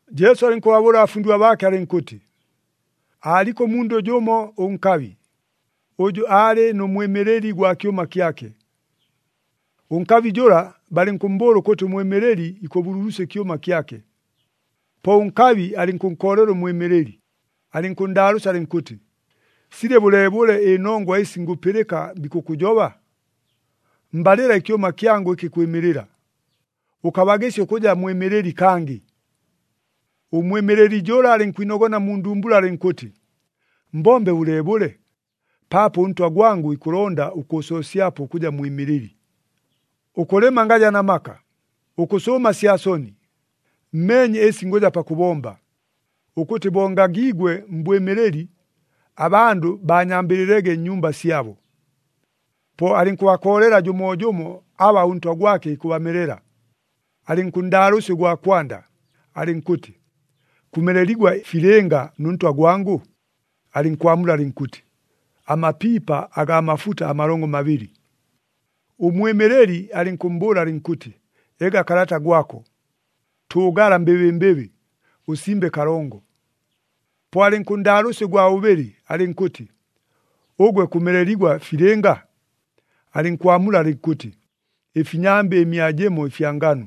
Jesu alɨnkʉbabʉʉla abafundigwa baake alɨnkʉtɨ, “Aaliko ʉmundʉ jʉmo ʉnkabi, ʉjʉ aalɨ nʉ mwɨmɨlɨli gwa kyʉma kyake. Ʉnkabi jʉla balɨnkʉmmbʉʉla ʉkʉtɨ ʉmwɨmɨlɨli ikʉbululusya ɨkyʉma kyake. Po ʉnkabi alɨnkʉnkoolela ʉmwɨmɨlɨli, alɨnkʉnndaalʉʉsya alɨnkʉtɨ, ‘Silɨ bʉleebʉle ɨnongwa ɨsi ngʉpɨlɨka bikʉkʉjoba? Mbalɨla ɨkyʉma kyangʉ ɨkɨ kwɨmɨlɨla! Ʉkabagɨsya ʉkʉja mwɨmɨlɨli kangɨ!’ “Ʉmwɨmɨlɨli jʉla alɨnkwinogona mu ndumbula alɨnkʉtɨ, ‘Mbombe bʉleebʉle? Paapo ʉntwa gwangʉ ikʉlonda ʉkʉʉsoosyapo ʉkʉja mwɨmɨlɨli. Ʉkʉlɨma ngaja na maka, ʉkʉsʉʉma sya soni. Mmeenye ɨsi ngʉja pakʉbomba, ʉkʉtɨ bo ngagiigwe mbwɨmɨlɨli, abandʉ baanyambɨlɨlege nnyumba syabo.’ “Po alɨnkʉbakoolela jʉmoojʉmo aba ʉntwa gwake ikʉbamelela. Alɨnkʉnndaalʉʉsya ʉgwa kwanda alɨnkʉtɨ, ‘Kʉmeleligwa filɨnga nʉ ntwa gwangʉ?’ Alɨnkwamula alɨnkʉtɨ, ‘Amapiipa agaa mafuta amalongo mabɨlɨ.’ Ʉmwɨmɨlɨli alɨnkʉmmbʉʉla alɨnkʉtɨ, ‘Ega kalata gwako, tʉʉgala mbɨbɨmbɨbɨ, ʉsimbe kalongo.’ Po alɨnkʉnndaalʉʉsya ʉgwa bʉbɨlɨ alɨnkʉtɨ, ‘Ʉgwe kʉmeleligwa filɨnga?’ Alɨnkwamula alɨnkʉtɨ, ‘Ɨfinyambɨ ɨmia jɨmo ɨfya nganu.’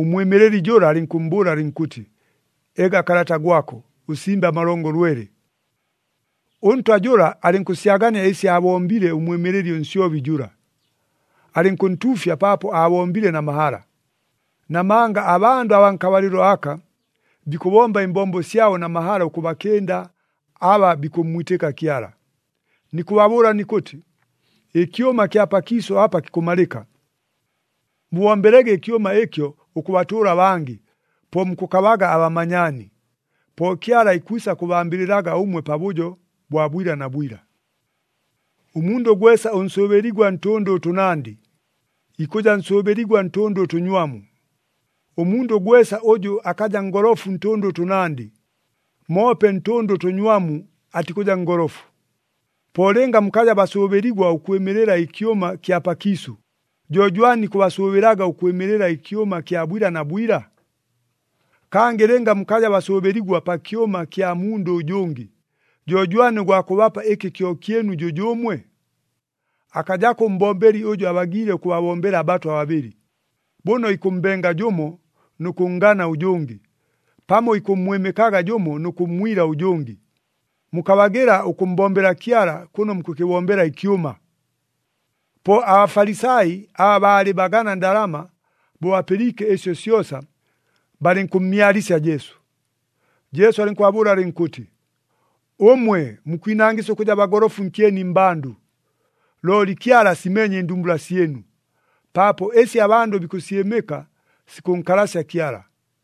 Ʉmwɨmɨlɨli jʉla alɨnkʉmmbʉʉla alɨnkʉtɨ, ‘Ega kalata gwako, ʉsimbe amalongo lwele.’ “Ʉntwa jʉla alɨnkʉsyagania ɨsi aabombile ʉmwɨmɨlɨli ʉnsyobi jʉla, alɨnkʉntuufya paapo aabombile na mahala. Namanga abandʉ abaa nkabalɨlo aka, bikʉbomba ɨmbombo syabo na mahala ʉkʉbakɨnda aba bikʉmmwitɨka Kyala. Nikʉbabʉʉla nikʉtɨ, ɨkyʉma kya pakiisʉ apa kikʉmalɨka. Mubombelege ɨkyʉma ɨkyo ʉkʉbatʉʉla abangɨ, po mukʉkabaga abamanyaani. Po Kyala ikwisa kʉbambɨlɨlaga ʉmwe pabʉjo bwa bwila na bwila. “Ʉmundʉ gwesa ʉnsʉʉbɨligwa ntʉndʉ ʉtʉnandɨ, ikʉja nsʉʉbɨligwa ntʉndʉ ʉtʉnywamu. Ʉmundʉ gwesa ʉjʉ akaja ngolofu ntʉndʉ ʉtʉnandɨ, moope ntʉndʉ ʉtʉnywamu atikʉja ngolofu. Po lɨnga mukaja basʉʉbɨligwa ʉkwɨmɨlɨla ɨkyʉma kya pakiisʉ, jo jwani ikʉbasʉʉbɨlaga ʉkwɨmɨlɨla ɨkyʉma kya bwila na bwila? Kangɨ lɨnga mukaja basʉʉbɨligwa pa kyʉma kya mundʉ ʉjʉngɨ, jo jwani ʉgwa kʉbapa ɨkɨ kyo kyɨnu jʉjʉʉmwe? Akajako ʉmbombeli ʉjʉ abagiile ʉkʉbabombela abatwa babɨlɨ. Bʉno ikʉmmbenga jʉmo nʉ kʉnngana ʉjʉngɨ, pamo ikʉmmwɨmɨkaga jʉmo nʉ kʉmmwila ʉjʉngɨ. Mukabagɨla ʉkʉmmbombela Kyala kʉno mukʉkɨbombela ɨkyʉma!” Po aBafalisai, aba baalɨ bagana ndalama, bo bapɨliike ɨsyo syosa, balɨnkʉmmyalisya Jesu. Jesu alɨnkʉbabʉʉla alɨnkʉtɨ, “Ʉmwe, mukwinangɨsya ʉkʉja bagolofu nkyeni mmbandʉ, looli Kyala asimeenye ɨndumbula syɨnu. Paapo ɨsi abandʉ bikʉsyɨmɨka, sikʉnkalasya Kyala!”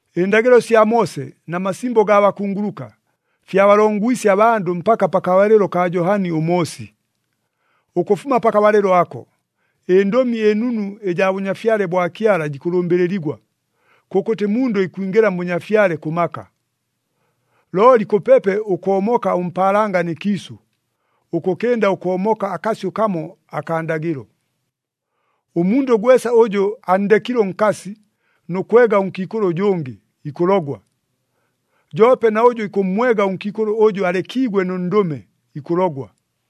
“Ɨndagɨlo sya Moose na masimbo gaa bakunguluka, fyabalongwisye abandʉ mpaka pakabalɨlo kaa Johani ʉMoosi. Ʉkʉfuma pakabalɨlo ako, ɨNdʉmi ɨNunu ɨjaa Bʉnyafyale bwa Kyala jikʉlʉmbɨlɨligwa, kʉkʉtɨ mundʉ ikwingɨla mBʉnyafyale kʉ maka. Looli kʉpepe ʉkoomoka ʉmpaalanga nɨ kiisʉ, ʉkʉkɨnda ʉkoomoka akasyʉ kamo akaa ndagɨlo. “Ʉmundʉ gwesa ʉjʉ anndekile ʉnkasi nʉ kwega ʉnkiikʉlʉ ʉjʉngɨ, ikʉlogwa. Joope na ʉjʉ ikʉmmwega ʉnkiikʉlʉ ʉjʉ alekiigwe nʉ ndʉme, ikʉlogwa.”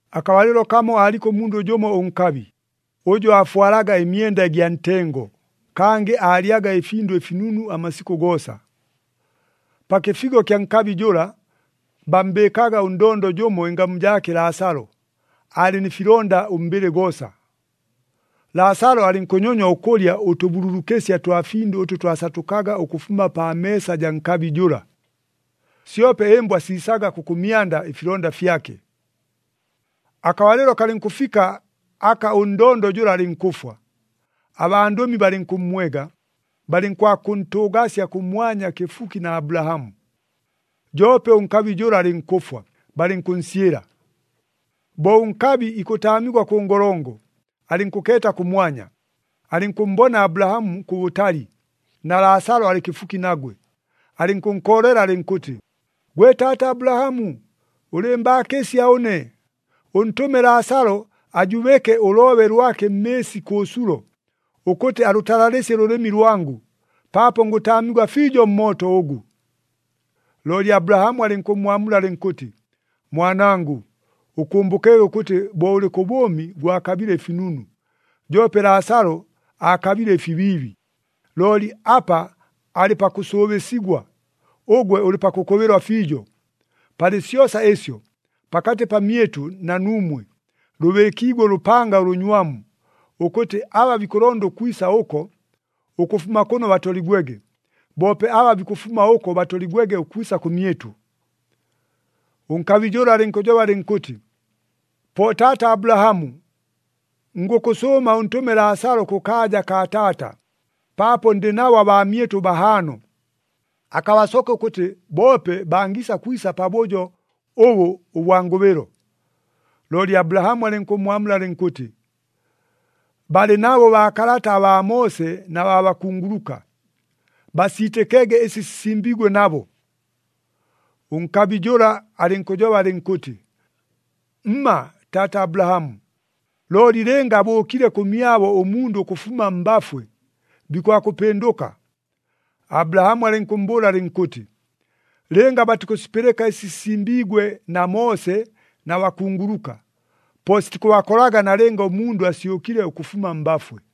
“Akabalɨlo kamo aaliko ʉmundʉ jʉmo ʉnkabi, ʉjʉ aafwalaga ɨmyenda ɨgya ntengo, kangɨ aalyaga ɨfindʉ ɨfinunu amasikʉ goosa. Pa kɨfigo kya nkabi jʉla, bammbɨɨkaga ʉndondo jʉmo ɨngamu jaake Laasalo, aalɨ nɨ filonda ʉmbɨlɨ goosa. Laasalo alɨnkʉnyonywa ʉkʉlya ʉtʉbululukɨsya twa findʉ ʉtʉ twasatʉkaga ʉkʉfuma pa meesa jaa nkabi jʉla, syope ɨmbwa siisaga kʉkʉmyanda ɨfilonda fyake. “Akabalɨlo kalɨnkʉfika aka ʉndondo jʉla alɨnkʉfwa, abandʉmi balɨnkʉmmwega, balɨnkwakʉntʉʉgasya kʉmwanya kɨfuki na Abulahamu. Joope ʉnkabi jʉla alɨnkʉfwa, balɨnkʉnsyɨla. Bo ʉnkabi ikʉtaamigwa kʉ ngolongo, alɨnkʉkeeta kʉmwanya, alɨnkʉmmbona Abulahamu kʉbʉtali, na Laasalo alɨ kɨfuki nagwe. Alɨnkʉnkoolela alɨnkʉtɨ, ‘Gwe taata Abulahamu, ʉlɨɨmbaakɨsya ʉne, ʉntʉme Laasalo, ajubɨke ʉloobe lwake mmɨɨsi kʉ sulo, ʉkʉtɨ alʉtalalɨsye ʉlʉlɨmi lwangʉ, paapo ngʉtaamigwa fiijo mmooto ʉgʉ.’ “Looli Abulahamu alɨnkʉmmwamula alɨnkʉtɨ, ‘Mwanangʉ, ʉkʉmbʉkege ʉkʉtɨ bo ʉlɨ kʉ bʉʉmi gwakabile ɨfinunu, joope Laasalo aakabile ɨfibiibi. Looli apa alɨ pakʉsʉʉbɨsigwa, ʉgwe ʉlɨ pakʉkʉbɨlwa fiijo. Palɨ syosa ɨsyo, pakatɨ pamyɨtʉ na nuumwe, lʉbɨɨkiigwe ʉlʉpanga ʉlʉnywamu, ʉkʉtɨ aba bikʉlonda ʉkwisa ʉko, ʉkʉfuma kʉno batoligwege, boope aba bikʉfuma ʉko batoligwege ʉkwisa kʉmyɨtʉ.’ “Ʉnkabi jʉla alɨnkʉjoba alɨnkʉtɨ, ‘Po taata Abulahamu, ngʉkʉsʉʉma ʉntʉme Laasalo kʉkaaja kaa taata, paapo ndɨ nabo abaamyɨtʉ bahaano. Akabasoke ʉkʉtɨ boope bangiisa kwisa pabʉjo ʉbʉ ʉbwa ngʉbɨlo.’ Looli Abulahamu alɨnkʉmmwamula alɨnkʉtɨ, ‘Balɨ nabo baakalata abaa Moose na baa bakunguluka. Basiitɨkege ɨsi sisimbiigwe nabo.’ “Ʉnkabi jʉla alɨnkʉjoba alɨnkʉtɨ, ‘Mma, taata Abulahamu! Looli lɨnga abʉʉkile kʉmyabo ʉmundʉ ʉkʉfuma mbafwe, bikwakʉpɨndʉka.’ Abulahamu alɨnkʉmmbʉʉla alɨnkʉtɨ, ‘Lɨnga batikʉsipɨlɨka ɨsi sisimbiigwe na Moose na bakunguluka, po sitikʉbakolaga nalɨnga ʉmundʉ asyʉkile ʉkʉfuma mbafwe.’”